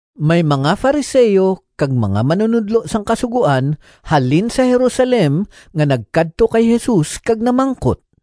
May mga Fariseo kag mga manunodlo sang Kasugoan halin sa Jerusalem nga nagkadto kay Jesus kag namangkot,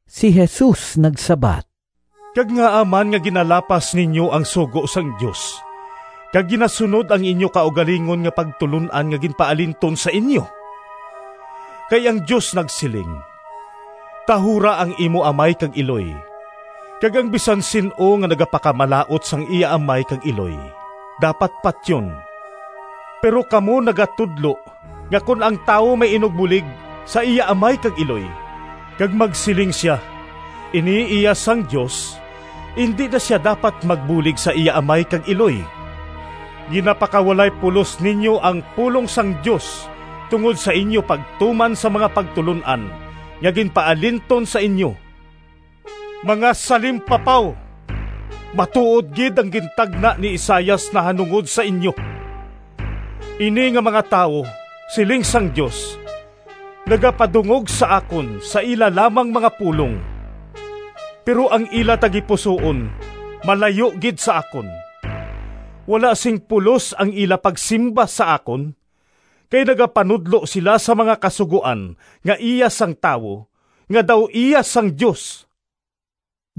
Si Jesus nagsabat, “Kag ngaa man nga ginalapas ninyo ang sugo sang Dios kag ginasunod ang inyo kaugalingon nga pagtulon-an nga ginpaalinton sa inyo? Kay ang Dios nagsiling, ‘Tahura ang imo amay kag iloy,’ kag ‘Ang bisan sin-o nga nagapakamalaut sang iya amay kag iloy dapat patyon.’ Pero kamo nagatudlo nga kon ang tawo may inugbulig sa iya amay kag iloy, kag magsiling sia, ‘Ini iya sang Dios,’ indi na sia dapat magbulig sa iya amay kag iloy. Ginapakawalay pulos ninyo ang pulong sang Dios tungod sa inyo pagtuman sang mga pagtulon-an nga ginpaalinton sa inyo. Mga salimpapaw! Matuod gid ang gintagna ni Isaias nahanungod sa inyo! ‘Ini nga mga tawo, siling sang Dios, Nagapadungog sa akon Sa ila lamang mga pulong, Pero ang ila tagipusoon Malayo gid sa akon. Wala sing pulos Ang ila pagsimba sa akon, Kay nagapanudlo sila Sang mga kasugoan Nga iya sang tawo, Nga daw iya sang Dios!’”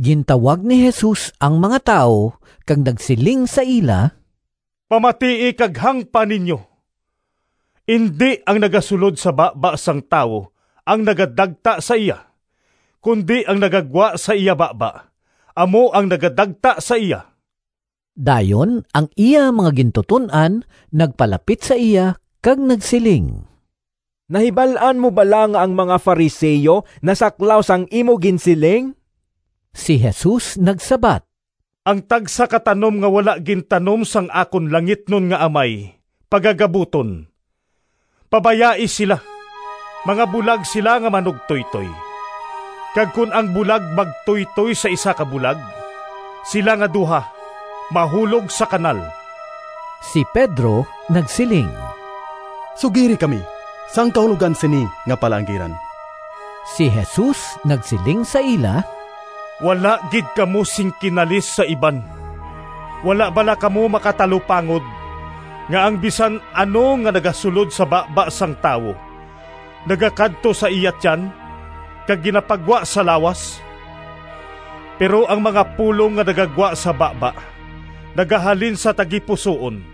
Gintawag ni Jesus ang mga tawo kag nagsiling sa ila, “Pamatii kag hangpa ninyo! Indi ang nagasulod sa baba sang tawo ang nagadagta sa iya, kundi ang nagagwa sa iya baba amo ang nagadagta sa iya.” Dayon ang iya mga gintuton-an nagpalapit sa iya kag nagsiling, “Nahibal-an mo bala nga ang mga Fariseo nasaklaw sang imo ginsiling?” Si Jesus nagsabat, “Ang tagsa ka tanom nga wala gintanom sang akon langitnon nga Amay pagagabuton. Pabayai sila! Mga bulag sila nga manugtoytoy, kag kon ang bulag magtuytoy sa isa ka bulag, sila nga duha mahulog sa kanal.” Si Pedro nagsiling, “Sugiri kami sang kahulogan sini nga palaanggiran.” Si Jesus nagsiling sa ila, “Wala gid kamo sing kinalis sa iban! Wala bala kamo makatalupangod nga ang bisan ano nga nagasulod sa baba sang tawo nagakadto sa iya tiyan kag ginapagwa sa lawas? Pero ang mga pulong nga nagagwa sa baba nagahalin sa tagipusoon,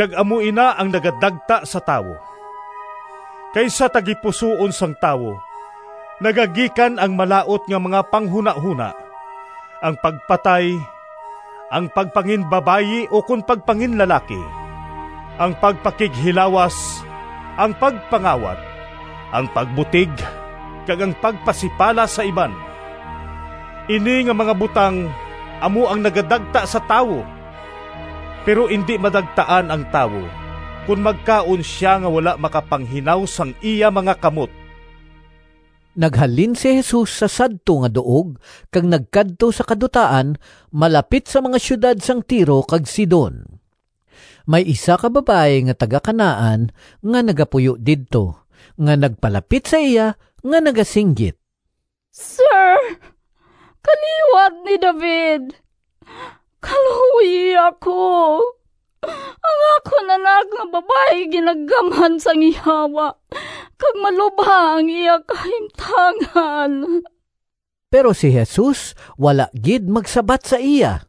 kag amo ina ang nagadagta sa tawo. Kay sa tagipusoon sang tawo nagagikan ang malaut nga mga panghunahona: ang pagpatay, ang pagpanginbabayi ukon pagpanginlalaki, ang pagpakighilawas, ang pagpangawat, ang pagbutig, kag ang pagpasipala sa iban. Ini nga mga butang amo ang nagadagta sa tawo. Pero indi madagtaan ang tawo kon magkaon sia nga wala makapanghinaw sang iya mga kamot.” Naghalin si Jesus sa sadto nga duog kag nagkadto sa kadutaan malapit sa mga siyudad sang Tiro kag Sidon. May isa ka babayi nga taga-Canaan nga nagapuyo didto, nga nagpalapit sa iya nga nagasinggit, “Sir, kaliwat ni David! Kaluoyi ako! Ang akon anak nga babayi ginagamhan sang yawa kag malubha ang iya kahimtangan.” Pero si Jesus wala gid magsabat sa iya.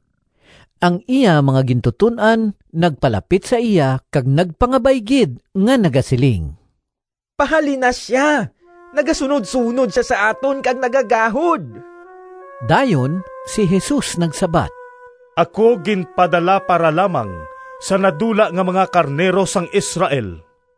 Ang iya mga gintuton-an nagpalapit sa iya kag nagpangabay gid nga nagasiling, “Pahalina sia! Nagasunodsunod sia sa aton kag nagagahod!” Dayon si Jesus nagsabat, “Ako ginpadala para lamang sa nadula nga mga karnero sang Israel.”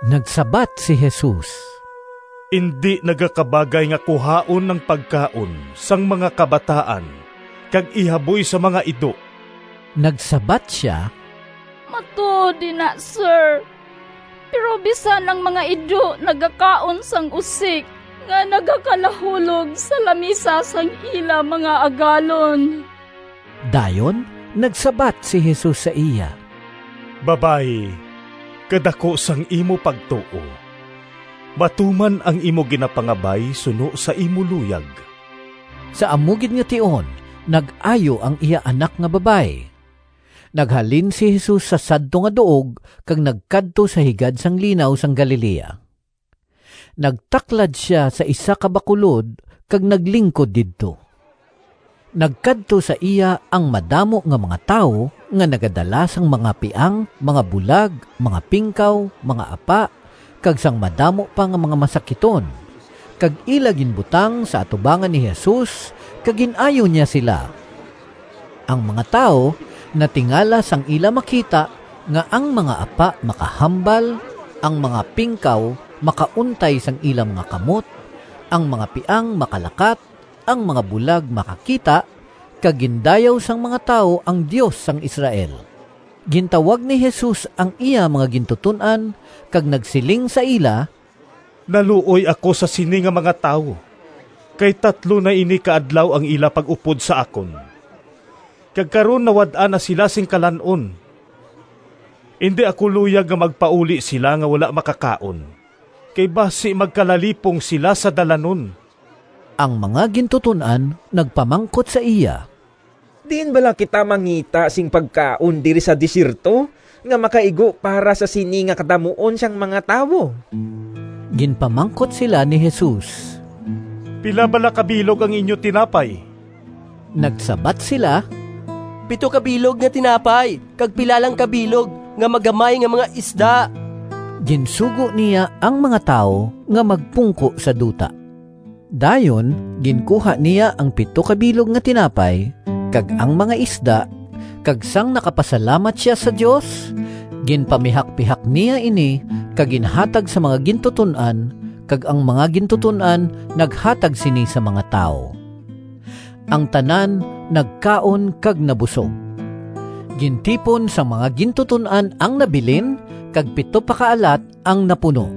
Nagsabat si Jesus, “Indi nagakabagay nga kuhaon ang pagkaon sang mga kabataan kag ihaboy sa mga ido.” Nagsabat sia, “Matuod ina, Sir, pero bisan ang mga ido nagakaon sang usik nga nagakalahulog sa lamisa sang ila mga agalon.” Dayon nagsabat si Jesus sa iya, “Babayi, kadaku sang imo pagtuo! Matuman ang imo ginapangabay suno sa imo luyag.” Sa amo gid nga tion nag-ayo ang iya anak nga babayi. Naghalin si Jesus sa sadto nga duog kag nagkadto sa higad sang Linaw sang Galilea. Nagtaklad sia sa isa ka bakulod kag naglingkod didto. Nagkadto sa iya ang madamo nga mga tawo nga nagadala sang mga piang, mga bulag, mga pingkaw, mga apa, kag sang madamo pa nga mga masakiton, kag ila ginbutang sa atubangan ni Jesus, kag gin-ayo niya sila. Ang mga tawo natingala sang ila makita nga ang mga apa makahambal, ang mga pingkaw makauntay sang ila mga kamot, ang mga piang makalakat, ang mga bulag makakita; kag gindayaw sang mga tawo ang Dios sang Israel. Gintawag ni Jesus ang iya mga gintuton-an kag nagsiling sa ila, “Naluoy ako sa sini nga mga tawo, kay tatlo na ini ka adlaw ang ila pag-upod sa akon, kag karon nawad-an na sila sing kalan-on. Indi ako luyag nga magpauli sila nga wala makakaon, kay basi magkalalipong sila sa dalanon.” Ang mga gintuton-an nagpamangkot sa iya, “Diin bala kita mangita sing pagkaon diri sa desierto nga makaigo para sa sini nga kadamuon sang mga tawo?” Ginpamangkot sila ni Jesus, “Pila bala ka bilog ang inyo tinapay?” Nagsabat sila, “Pito ka bilog nga tinapay kag pila lang ka bilog nga magamay nga mga isda.” Ginsugo niya ang mga tawo nga magpungko sa duta. Dayon ginkuha niya ang pito ka bilog nga tinapay kag ang mga isda, kag sang nakapasalamat sia sa Dios, ginpamihakpihak niya ini kag ginhatag sa mga gintuton-an, kag ang mga gintuton-an naghatag sini sa mga tawo. Ang tanan nagkaon kag nabusog. Gintipon sang mga gintuton-an ang nabilin kag pito pa ka alat ang napuno.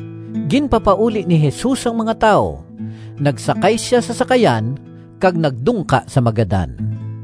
Ginpapauli ni Jesus ang mga tawo, nagsakay sia sa sakayan kag nagdungka sa Magadan.